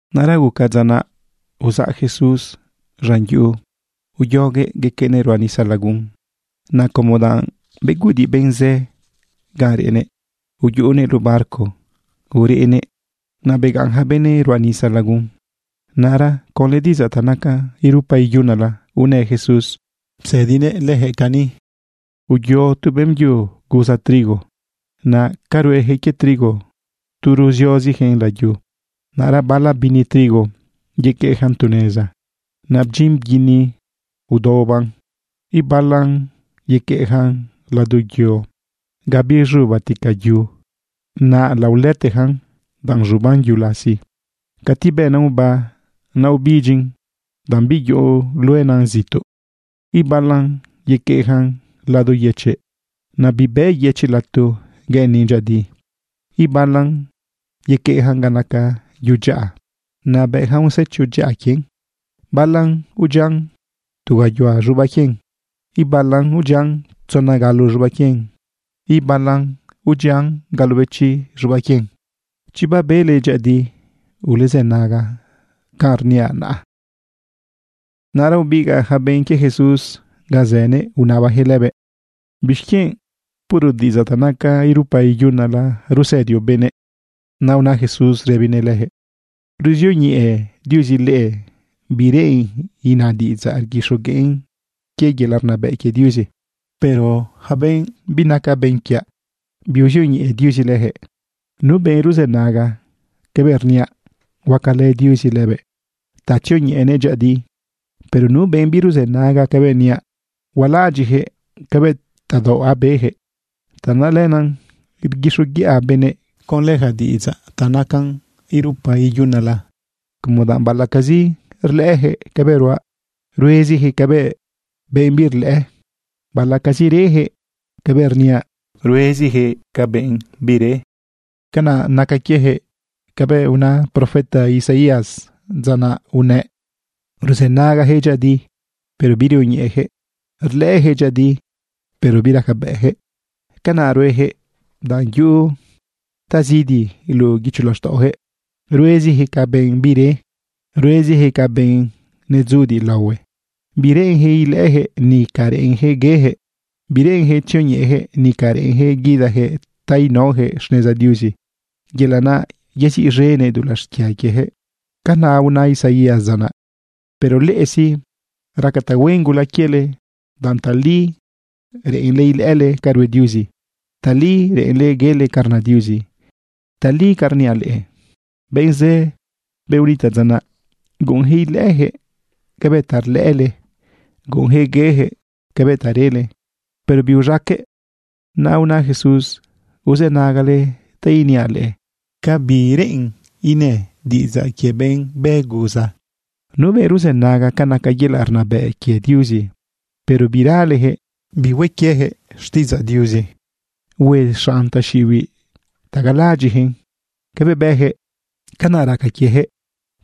Naꞌra guca dza naꞌ uzaꞌ Jesús z̃an yuꞌu uyoguëꞌ yequeꞌnëꞌ ruꞌa nisa lagun. Naꞌ como danꞌ beguꞌudiꞌ benꞌ zë ganꞌ reꞌnëꞌ, uyuꞌunëꞌ luꞌu barco ureꞌnëꞌ. Naꞌ begaꞌn ja benëꞌ ruꞌa nisa lagun. Naꞌra conlë diꞌidzaꞌ ta nacan irupa iyunala unë Jesús psëdinëꞌ leyaquëꞌ cani: ―Uyo tu beꞌmbyu guza trigo. Naꞌ ca ruejëꞌ quie trigo, tu ruziozijëꞌn layu. Naꞌra bala bini trigo yequeꞌjan tu neza. Naꞌ bdyin bguini aodaobaꞌn. Ibalan yequeꞌjan lado yo ga biz̃ubatica yu. Naꞌ laolëtejan danꞌ z̃uban yu lasi. Cati bena oba, naꞌ ubidyin danꞌ biyuꞌu luena zituꞌ. Ibalan yequeꞌjan lado yëchiꞌ. Naꞌ bibë yëchiꞌ lato gueꞌenin dyëꞌëdi. Ibalan yequeꞌjan ga naca yu dyaꞌa. Naꞌ bëꞌjan usecho dyaꞌa quien. Balan udyian tu gayuhua z̃ubaꞌ quien. Ibalan udyian tzona galo z̃ubaꞌ quien. Ibalan udyian galobechi z̃ubaꞌ quien. Chi babele dyëꞌëdiꞌ, ulezënaga canꞌ rniaꞌ naꞌ. Naꞌra ubigaꞌ ja benꞌ quie Jesús ga zënëꞌ unabajëꞌ lëbëꞌ: ―¿Bixquienꞌ puro diꞌidzaꞌ ta nacan irupa iyunala rusëdioꞌ benëꞌ? Naꞌ una Jesús rëbinëꞌ lëjëꞌ: ―Ruzioñeꞌe Diuzi leꞌe bi reꞌen ina diꞌidzaꞌ rguixogueꞌn quie yelaꞌ rnabëꞌ quie Diuzi. Pero yaca benꞌ binaca benꞌ quiaꞌ, biuzioñeꞌe Diuzi lëjëꞌ. Nu benꞌ ruzënaga cabëꞌ rniaꞌ, huacalë Diuzi lëbëꞌ ta tzioñeꞌenëꞌ dyëꞌëdi. Pero nu benꞌ biruzënaga cabëꞌ rniaꞌ, hualaꞌadyiꞌjëꞌ cabëꞌ tadaoꞌ abejëꞌ. Tanaꞌ lenaꞌ rguixoguiꞌa benëꞌ conlë yaca diꞌidzaꞌ ta nacan irupa iyunala, como danꞌ baꞌalaꞌcazi rlëꞌëjëꞌ cabëꞌ ruaꞌ, ruezijëꞌ ca benꞌ birlëꞌë, baꞌalaꞌcazi rejëꞌ cabëꞌ rniaꞌ, ruezijëꞌ ca benꞌ bire. Canaꞌ naca quiejëꞌ cabëꞌ una profeta Isaías dza naꞌ unëꞌ: Ruzënagajëꞌ dyëꞌëdi, pero birioñeꞌejëꞌ. Rlëꞌëjëꞌ dyëꞌëdi, pero biracabëꞌjëꞌ. Canaꞌ ruejëꞌ danꞌ yuꞌu tazidi luꞌu guicho laxtaꞌojëꞌ. Ruezijëꞌ ca benꞌ bire, ruezijëꞌ ca benꞌ netzudiꞌ laohue. Bireꞌenjëꞌ ilëꞌëjëꞌ, nica reꞌenjëꞌ guejëꞌ. Bireꞌenjëꞌ tzioñeꞌejëꞌ, nica reꞌenjëꞌ guidajëꞌ ta inaojëꞌ xneza Diuzi yelaꞌ naꞌ yeziꞌz̃enëꞌ dulaꞌ xquia quiejëꞌ. Canaꞌ una Isaías dza naꞌ. ’Pero leꞌe sí, raca tahuen gula quiele danꞌ tali reꞌenle ilëꞌële ca rue Diuzi, tali reꞌenle guele ca rna Diuzi. Tali ca rniaꞌ leꞌe, benꞌ zë, benꞌ unitaꞌ dza naꞌ, guꞌunjëꞌ ilëꞌëjëꞌ cabëꞌ ta rlëꞌële, guꞌunjëꞌ guejëꞌ cabëꞌ ta rele, pero biuz̃aqueꞌ. Naꞌ una Jesús: ―Uzënagale ta iniaꞌ leꞌe ca bi reꞌen inë diꞌidzaꞌ quie benꞌ bë guza. Nu benꞌ ruzënaga ca naca yelaꞌ rnabëꞌ quie Diuzi, pero biralejëꞌ bihue quieyaquëꞌ xtiꞌidzaꞌ Diuzi, hue xanꞌ taxiꞌibiꞌ ta galaꞌadyiꞌjëꞌ cabëꞌ bejëꞌ. Canaꞌ raca quiejëꞌ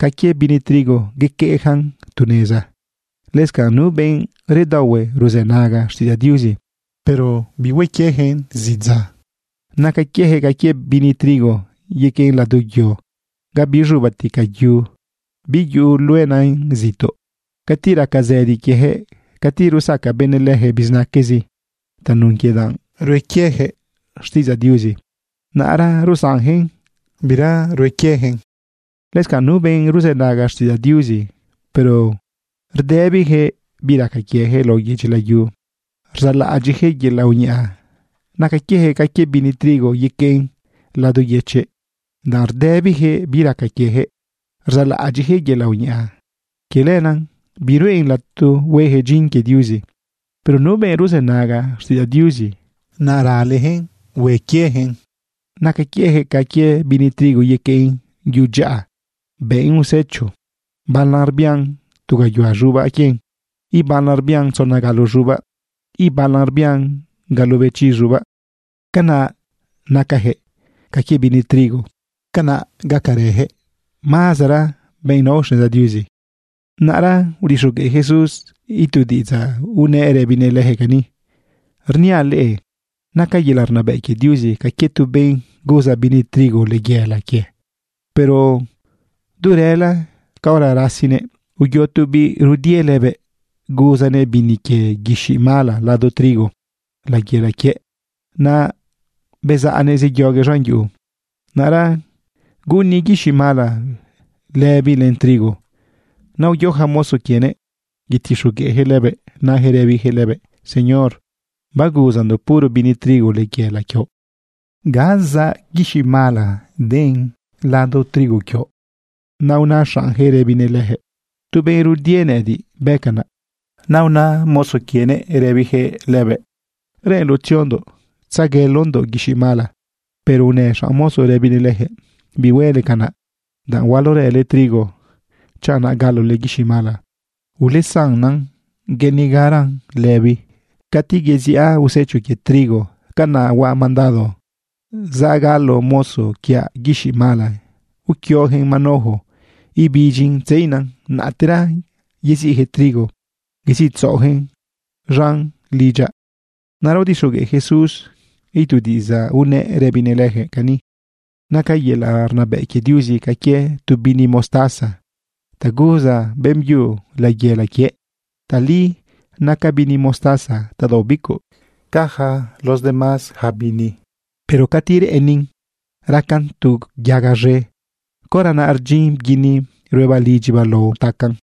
ca quie bini trigo yequeꞌjan tu neza. Lëscanꞌ nu benꞌ redaohue ruzënaga xtiꞌidzaꞌ Diuzi, pero bihue quieyaquëꞌn zidza, naca quiejëꞌ ca quie bini trigo yequeꞌ lado yo ga biz̃ubatica yu biyuꞌu luena zituꞌ. Cati raca zëdi quiejëꞌ, cati rusaca benëꞌ lëjëꞌ bizinaquezi tanun quie danꞌ rue quieyaquëꞌ xtiꞌidzaꞌ Diuzi, naꞌra rusanjëꞌn, bira rue quieyaquëꞌn. Lëscanꞌ nu benꞌ ruzënaga xtiꞌidzaꞌ Diuzi, pero rdëbijëꞌ bi raca quiejëꞌ lao yedyi layu, rzaꞌlaꞌadyiꞌjëꞌ yelaꞌ uñaꞌa, naca quiejëꞌ ca quie bini trigo yequeꞌn lado yëchiꞌ. Danꞌ rdëbijëꞌ bi raca quiejëꞌ rzaꞌlaꞌadyiꞌjëꞌ yelaꞌ uñaꞌa, quie lenaꞌ biruꞌen lato huejëꞌ dyin quie Diuzi. Pero nu benꞌ ruzënaga xtiꞌidzaꞌ Diuzi, naꞌ ralejëꞌn hue quieyaquëꞌn, naca quiejëꞌ ca quie bini trigo yequeꞌn yu dyaꞌa bëꞌn usecho. Balan rbian tu gayuhua z̃ubaꞌ. Ibalan rbian tzona galo z̃ubaꞌ. Ibalan rbian galobechi z̃ubaꞌ. Canaꞌ nacajëꞌ ca quie bini trigo. Canaꞌ gacarajëꞌ mazara benꞌ nao xneza Diuzi. Naꞌra udixogueꞌ Jesús itu diꞌidzaꞌ, unëꞌ rëbinëꞌ lëjëꞌ cani: ―Rniaꞌ leꞌe naca yelaꞌ rnabëꞌ quie Diuzi ca quie tu benꞌ guza bini trigo layela quie. Pero du rëla caora rasinëꞌ, uyo tu biꞌ rudie lëbëꞌ guzanëꞌ bini quie guixiꞌ mala lado trigo layela quiëꞌ. Naꞌ bezaꞌnëꞌ zeyoguëꞌ z̃an yuꞌu. Naꞌra guꞌuni guixiꞌ mala lëbi len trigo. Naꞌ uyo ja mozo quienëꞌ yetixogueꞌjëꞌ lëbëꞌ, najëꞌ rëbijëꞌ lëbëꞌ: “Señor, baguzandoꞌ puro bini trigo layela quioꞌ, ¿ga zaꞌ guixiꞌ mala den lado trigo quioꞌ?” Naꞌ una xaꞌnjëꞌ rëbinëꞌ lëjëꞌ: “Tu benꞌ rudie nëꞌëdiꞌ bë canaꞌ.” Naꞌ una mozo quienëꞌ rëbijëꞌ lëbëꞌ: “¿Reꞌenloꞌ tziondoꞌ tzeguelondoꞌ guixiꞌ mala?” Pero unë xanꞌ mozo rëbinëꞌ lëjëꞌ: “Bihuele canaꞌ, danꞌ hualorële trigo chanꞌ naꞌ galole guixiꞌ mala. Ulesannan gueꞌenigaran lëbi. Cati yeziꞌa usecho quie trigo, canaꞌ huaꞌ mandado zagalo mozo quiaꞌ guixiꞌ mala uquiojëꞌn manojo ibidyin tzeina. Naꞌtera yeziꞌjëꞌ trigo yeziꞌtzaꞌojëꞌn z̃an lidyaꞌ.” Naꞌra udixogueꞌ Jesús itu diꞌidzaꞌ, unëꞌ rëbinëꞌ lëjëꞌ cani: ―Naca yelaꞌ rnabëꞌ quie Diuzi ca quie tu bini mostaza ta guza beꞌmbyu layela quiëꞌ. Tali naca bini mostaza tadaoꞌ bicuꞌ ca yaca los demás ja bini. Pero cati reꞌenin racan tu yaga z̃e, caora naꞌ rdyin bguini ruebaꞌ lidyibaꞌ lao tacaꞌn.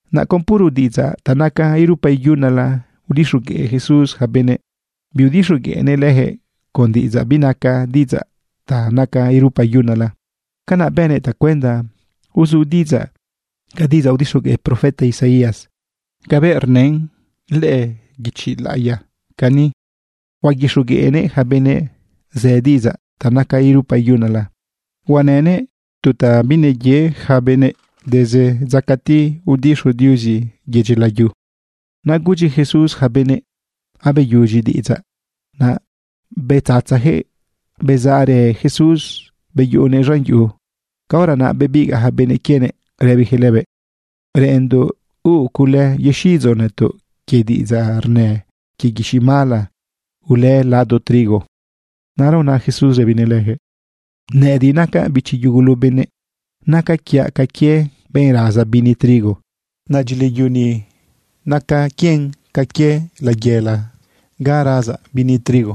Naꞌ con puro diꞌidzaꞌ ta nacan irupa iyunala udixogueꞌ Jesús ja benëꞌ. Biudixogueꞌnëꞌ lëjëꞌ con diꞌidzaꞌ binaca diꞌidzaꞌ ta nacan irupa iyunala. Canaꞌ bënëꞌ tacuenda uzu diꞌidzaꞌ ca diꞌidzaꞌ udixogueꞌ profeta Isaías cabëꞌ rnën lëꞌë guichi laꞌiya cani: Huaguixogueꞌnëꞌ ja benëꞌ zë diꞌidzaꞌ ta nacan irupa iyunala. Huanënëꞌ tu ta bineye ja benëꞌ desde dza cati udixu Diuzi yedyi layu. Naꞌ gudyi Jesús ja benëꞌ: ―Abeyudyi diꞌidzaꞌ. Naꞌ bedzatzajëꞌ bezaꞌrë Jesús beyuꞌunëꞌ z̃an yuꞌu. Caora naꞌ bebigaꞌ ja benꞌ quienëꞌ rëbijëꞌ lëbëꞌ: ―Reꞌenndoꞌ huuꞌ cule yexiꞌidzoꞌ nëtoꞌ quie diꞌidzaꞌ rnën quie guixiꞌ mala ulë lado trigo. Naꞌra una Jesús rëbinëꞌ lëjëꞌ: ―Nëꞌëdiꞌ nacaꞌ bichi yugulu benëꞌ, naca quiaꞌ ca quie benꞌ raza bini trigo. Naꞌ dyilayu ni naca quien ca quie layela ga razaꞌ bini trigo.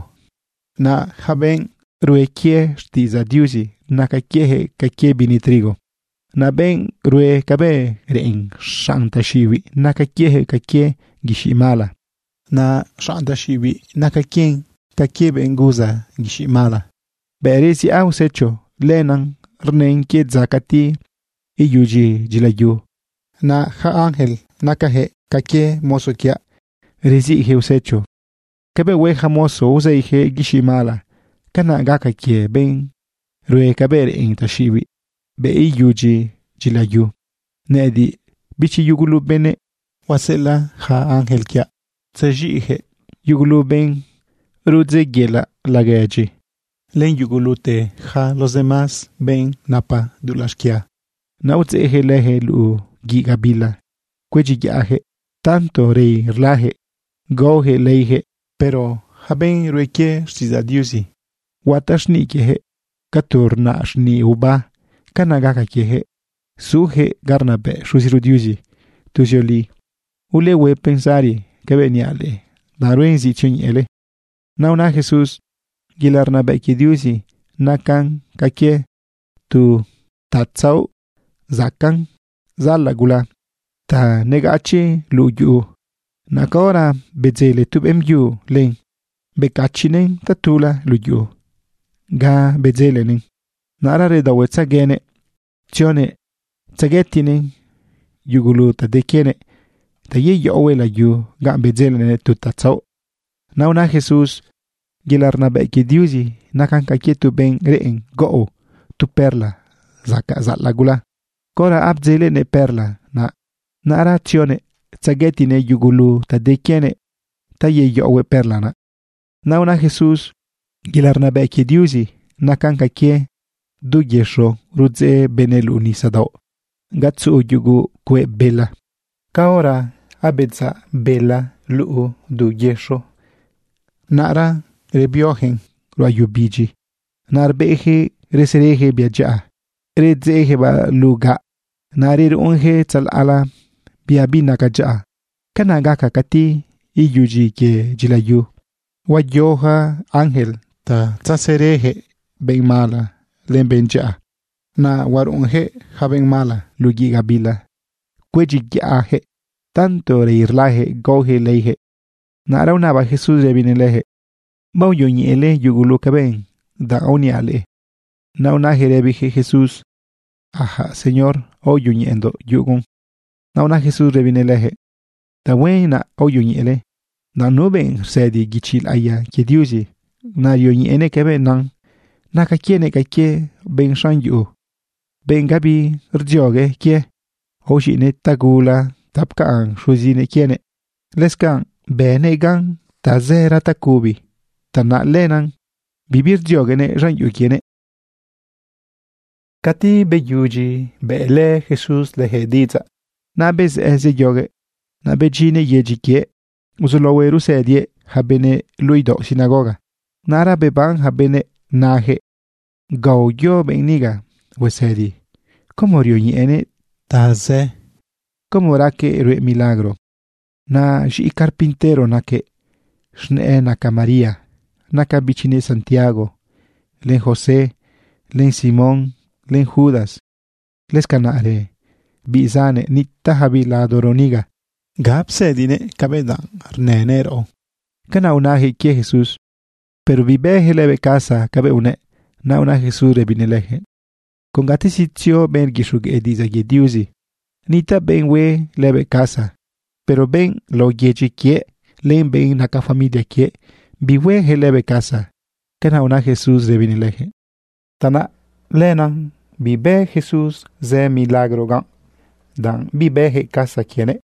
Naꞌ yaca benꞌ rue quie xtiꞌidzaꞌ Diuzi, naca quiejëꞌ ca quie bini trigo. Naꞌ benꞌ rue cabëꞌ reꞌen xanꞌ taxiꞌibiꞌ, naca quiejëꞌ ca quie guixiꞌ mala. Naꞌ xanꞌ taxiꞌibiꞌ naca quien ca quie benꞌ guza guixiꞌ mala. Bëꞌ reziꞌa usecho, lenaꞌ rnën quie dza cati iyudyi dyilayu. Naꞌ yaca ángel nacajëꞌ ca quie mozo quiaꞌ reziꞌjëꞌ usecho. Cabëꞌ hue ja mozo uzeijëꞌ guixiꞌ mala, canaꞌ gaca quie benꞌ rue cabëꞌ reꞌen taxiꞌibiꞌ bëꞌ iyudyi dyilayu. Nëꞌëdiꞌ, bichi yugulu benëꞌ, huaseꞌelaꞌ yaca ángel quiaꞌ tzexiꞌjëꞌ yugulu benꞌ rudzeꞌyela laguedyi, len yugulute yaca los demás benꞌ napa dulaꞌ xquia. Naꞌ udzeꞌjëꞌ lëjëꞌ luꞌu guiꞌ gabila cuedyiyaꞌjëꞌ. Tanto rei rlajëꞌ gaojëꞌ leijëꞌ. Pero yaca benꞌ rue quie xtiꞌidzaꞌ Diuzi, huataꞌ xniꞌ quiejëꞌ ca tu rnaꞌ xniꞌ oba. Canaꞌ gaca quiejëꞌ zujëꞌ ga rnabëꞌ Xuziro Diuzi tuzioli. Ulehue pensari cabëꞌ niaꞌ leꞌe, danꞌ ruen zi tzioñeꞌele. Naꞌ una Jesús: ―Yelaꞌ rnabëꞌ quie Diuzi nacan ca quie tu tatzaoꞌ zacaꞌn zaꞌalaꞌ gula ta negachiꞌ luꞌu yu. Naꞌ caora bedzele tu beꞌmbyu len, becachiꞌnëꞌn tatula luꞌu yu ga bedzelenëꞌn. Naꞌra redaohuetzeguenëꞌ tzionëꞌ tzeguetiꞌnëꞌ yugulu ta de quienëꞌ ta yeyaꞌohuëꞌ layu naꞌ ga bedzelenëꞌ tu tatzaoꞌ. Naꞌ una Jesús: ―Yelaꞌ rnabëꞌ quie Diuzi nacan ca quie tu benꞌ reꞌen gaꞌo tu perla zacaꞌn zaꞌalaꞌ gula. Caora abdzelenëꞌ perla naꞌ, naꞌra tzionëꞌ tzeguetiꞌnëꞌ yugulu ta de quienëꞌ ta yeyaꞌohuëꞌ perla naꞌ. Naꞌ una Jesús: ―Yelaꞌ rnabëꞌ quie Diuzi nacan ca quie du yëxo rudzeꞌ benëꞌ luꞌu nisadaoꞌ ga tzuꞌu yugu cueꞌ bela. Caora abedzaꞌ bela du yëxo, naꞌra rebiojëꞌn ruꞌa yu bidyi. Naꞌ rbeꞌjëꞌ rsërejëꞌ bia dyaꞌa, redzeꞌjëꞌbaꞌ luꞌu gaꞌ. Naꞌ reruꞌunjëꞌ tzalaꞌla bia binaca dyaꞌa. Canaꞌ gaca cati iyudyi quie dyilayu. Huayo ja ángel ta tzesëreyaquëꞌ benꞌ mala len benꞌ dyaꞌa. Naꞌ huaruꞌunyaquëꞌ yaca benꞌ mala luꞌu guiꞌ gabila cuedyiyaꞌjëꞌ. Tanto rei rlajëꞌ gaojëꞌ leijëꞌ. Naꞌra unaba Jesús rëbinëꞌ lëjëꞌ: ―¿Baoyoñeꞌele yugulu cabëꞌ ta aoniaꞌ leꞌe? Naꞌ unajëꞌ rëbijëꞌ Jesús: ―Ajaꞌ Señor, aoyoñeꞌendoꞌ yugun. Naꞌ una Jesús rëbinëꞌ lëjëꞌ: ―Tahuen naꞌ aoyoñeꞌele, danꞌ nu benꞌ rsëdi guichi laꞌiya quie Diuzi, naꞌ rioñeꞌenëꞌ cabëꞌ nan, naca quienëꞌ ca quie benꞌ xanꞌ yuꞌu, benꞌ gabi rdziogue quie. Aoz̃iꞌnëꞌ tagula ta pcaꞌn xuzinëꞌ quienëꞌ. Lëscanꞌ bënëꞌ gan tazëra tacubi. Tanaꞌ lenaꞌ bibi rdzioguenëꞌ z̃an yuꞌu quienëꞌ. Cati beyudyi bëꞌlë Jesús leyaquëꞌ diꞌidzaꞌ, naꞌ bezëꞌë zeyoguëꞌ. Naꞌ bedyinnëꞌ yedyi quiëꞌ, uzulaohuëꞌ rusëdiëꞌ ja benëꞌ luꞌu idaoꞌ sinagoga. Naꞌra beban ja benëꞌ rëbijëꞌ: ―¿Ga uyo benꞌ niga huesëdi como rioñeꞌenëꞌ ta zë? ¿Cómo raquëꞌ rue milagro? Naꞌ z̃iꞌi carpintero naquëꞌ. Z̃nëꞌë naca María. Naca bichinëꞌ Santiago, len José, len Simón, len Judas. Lëscanaꞌrë biꞌ zannëꞌ, nitaꞌjabiꞌ ladoro niga. ¿Ga psëdinëꞌ cabëꞌ danꞌ rnënëꞌ raꞌo? ―Canaꞌ unajëꞌ quie Jesús. Pero bibëjëꞌ lëbëꞌ casa cabëꞌ unëꞌ. Naꞌ una Jesús rëbinëꞌ lëjëꞌ: ―Con gatezi tzio benꞌ rguixogueꞌ diꞌidzaꞌ quie Diuzi, nitaꞌ benꞌ hue lëbëꞌ casa. Pero benꞌ lao yedyi quiëꞌ len benꞌ naca familia quiëꞌ, bihuejëꞌ lëbëꞌ casa. ―Canaꞌ una Jesús rëbinëꞌ lëjëꞌ. Tanaꞌ lenaꞌ, bibë Jesús zë milagro ganꞌ, danꞌ bibëjëꞌ casa quienëꞌ.